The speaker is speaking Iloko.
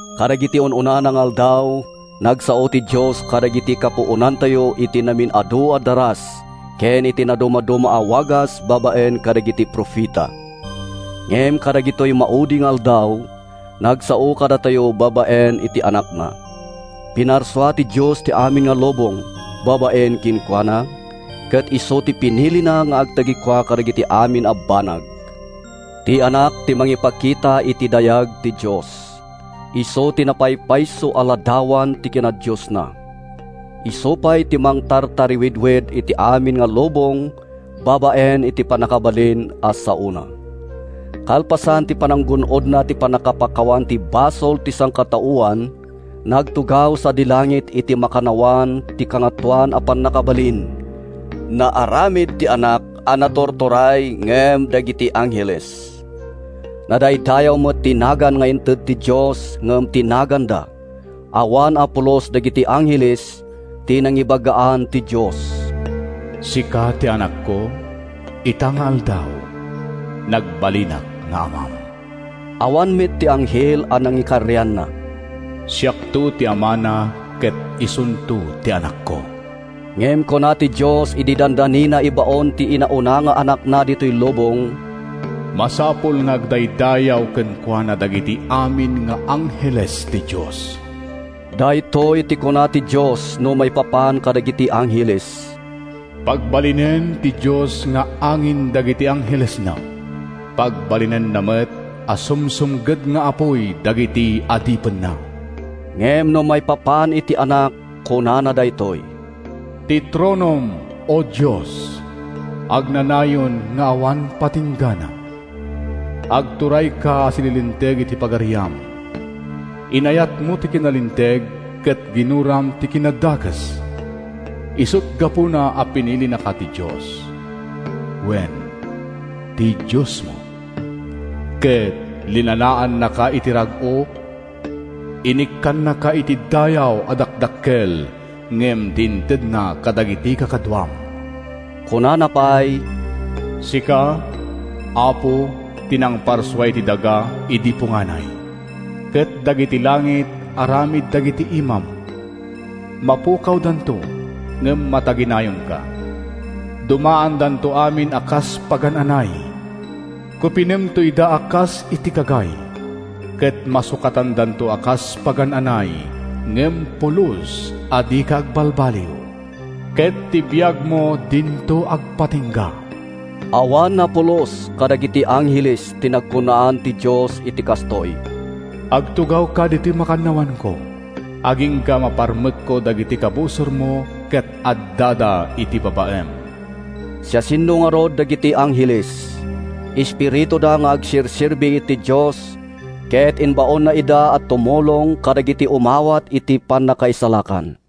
Kadagidi un-unana nga aldaw, nagsao ti Dios kadagidi kapuonantayo iti namin-adu a daras ken iti nadumaduma a wagas babaen kadagiti profeta. Ngem kadagitoy maudi nga aldaw, nagsao kadatayo babaen iti Anakna. Pinarsua ti Dios ti amin a lubong babaen kenkuana, ket isu ti pinilina nga agtagikua kadagiti amin a banag. Ti Anak ti mangipakita iti dayag ti Dios. Isu ti napaypayso a ladawan ti kinadiosna. Isu pay ti mangtartarawidwid iti amin a lubong babaen iti mannakabalin a saona. Kalpasan ti pananggun-odna iti pannakapakawan ti basol ti sangkataoan, nagtugaw sadi langit iti makannawan ti Kangatoan a Pannakabalin. Naaramid ti Anak a naturturay ngem dagiti angheles. Nadaydayaw met ti naganna nga inted ti Dios ngem ti naganda. Awan a pulos kadagiti angheles ti nangibagaan ti Dios, “Sika ti Anakko; Ita nga aldaw, nagbalinak nga Amam.” Awan met ti anghel a nangikarianna, “Siakto ti Amana, Ket isunto ti Anakko.” Ngem kuna ti Dios idi dandanina ibaon ti inauna nga Anakna ditoy lubong, “Masapul nga agdaydayaw kenkuana dagiti amin nga angheles ti Dios.” Daytoy ti kuna ti Dios no maipapan kadagiti angheles: “Pagbalinen ti Dios nga angin dagiti anghelesna. Pagbalinenna met a sumsumged nga apuy dagiti adipenna.” Ngem no maipapan iti Anak, kunana daytoy: “Ti tronom, O Dios, agnanayon nga awan patinggana! Agturayka a sililinteg iti pagariam. Inayatmo ti kinalinteg ket ginuram ti kinadakes. Isut’ gapuna a pinilinaka ti Dios; wen, ti Diosmo. Ket linanaannaka iti rag-o—inikkannaka iti dayaw a dakdakkel ngem ti intedna kadagiti kakaduam.” Kunana pay, “Sika, Apo, ti nangparsua iti daga idi punganay, Ket dagiti langit aramid dagiti imam. Mapukawdanto, ngem mataginayonka. Dumaandanto amin a kas pagan-anay. Kupinemto ida a kas iti kagay, ket masukatandanto a kas pagan-anay, ngem pulos a dika agbalbaliw, ket ti biagmo dinto agpatingga.” Awan a pulos kadagiti angheles ti nagkunaan ti Dios iti kastoy: “Agtugawka ditoy makannawanko, agingga a maparmekko dagiti kabusormo ket addada iti babaem.” Siasino ngarud dagiti angheles? Espirituda nga agserserbi iti Dios ket imbaonna ida a tumulong kadagiti umawat iti pannakaisalakan.